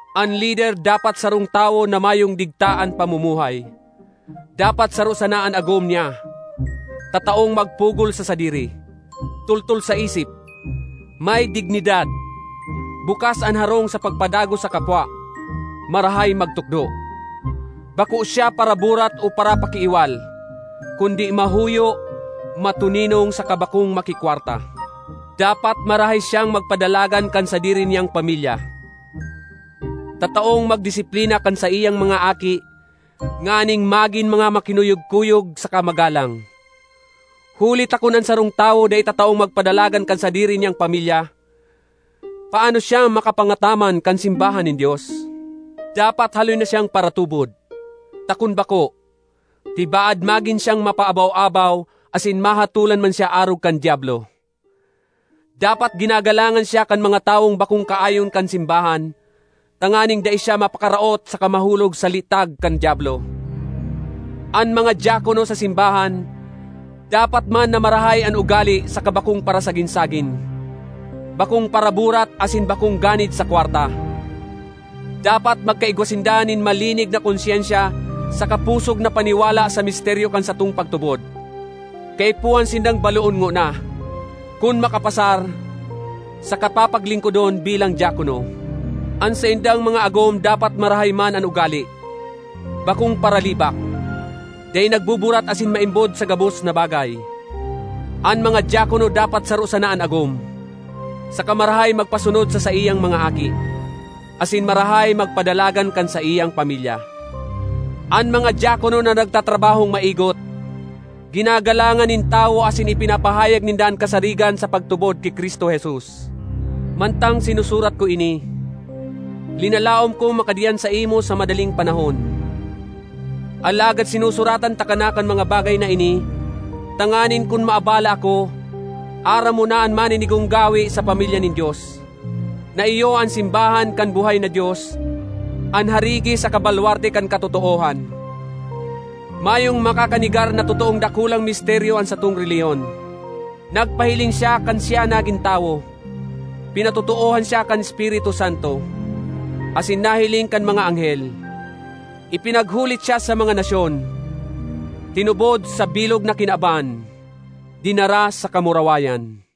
An lider dapat sarong tawo na mayong digta an pamumuhay. Dapat saro sana an agom niya, tataong magpugol sa sadiri, toltol sa isip, may dignidad, bukas an harong sa pagpadagos sa kapwa, marahay magtukdo. Bako siya paraburat o parapakiiwal, kundi mahuyo, matoninong saka bakong makikwarta. Dapat marahay siyang magpadalagan kan sadiri niyang pamilya, tataong magdisiplina kan saiyang mga aki nganing magin mga makinuyog-kuyog saka magalang. Huli ta kun an sarong tawo dai tataong magpadalagan kan sadiri niyang pamilya, paano siyang makapangataman kan simbahan nin Dios? Dapat haloy na siyang paratubod, ta kun bako, tibaad magin siyang mapaabaw-abaw asin mahatolan man siya arog kan Diablo. Dapat ginagalangan siya kan mga tawong bakong kaayon kan simbahan tanganing dai siya mapakaraot saka mahulog sa litag kan Diablo. An mga diakono sa simbahan dapat man na marahay an ugale saka bakong parasagin-sagin, bakong paraburat asin bakong ganid sa kwarta. Dapat magkaigwa sinda nin malinig na konsyensya saka pusog na paniwala sa misteryo kan satong pagtubod. Kaipuhan sindang baloon ngona; kun makapasar, saka papaglingkodon bilang diakono. An saindang mga agom dapat marahay man an ugale, bakong paralibak, dai nagbuburat asin maimbod sa gabos na bagay. An mga diakono dapat saro sana an agom, saka marahay magpasunod sa saiyang mga aki, asin marahay magpadalagan kan saiyang pamilya. An mga diakono na nagtatrabahong maigot, ginagalangan nin tawo asin ipinapahayag ninda an kasarigan sa pagtubod ki Cristo Jesus. Mantang sinusurat ko ini, linalaom kong makadiyan saimo sa madaling panahon. Alagad sinusuratan taka na kan mga bagay na ini tanganing kun maabala ako, aram mo na an maninigong gawe sa pamilya nin Dios, na iyo an simbahan kan buhay na Dios, an harigi saka balwarte kan katotoohan. Mayong makakanegar na totoong dakulang misteryo an satong relihiyon: Nagpahiling siya kan siya nagin tawo, pinatotoohan siya kan Espiritu Santo, asin nahiling kan mga anghel. Ipinaghulit siya sa mga nasyon, tinubod sa bilog na kinaban, dinara sa kamurawayan.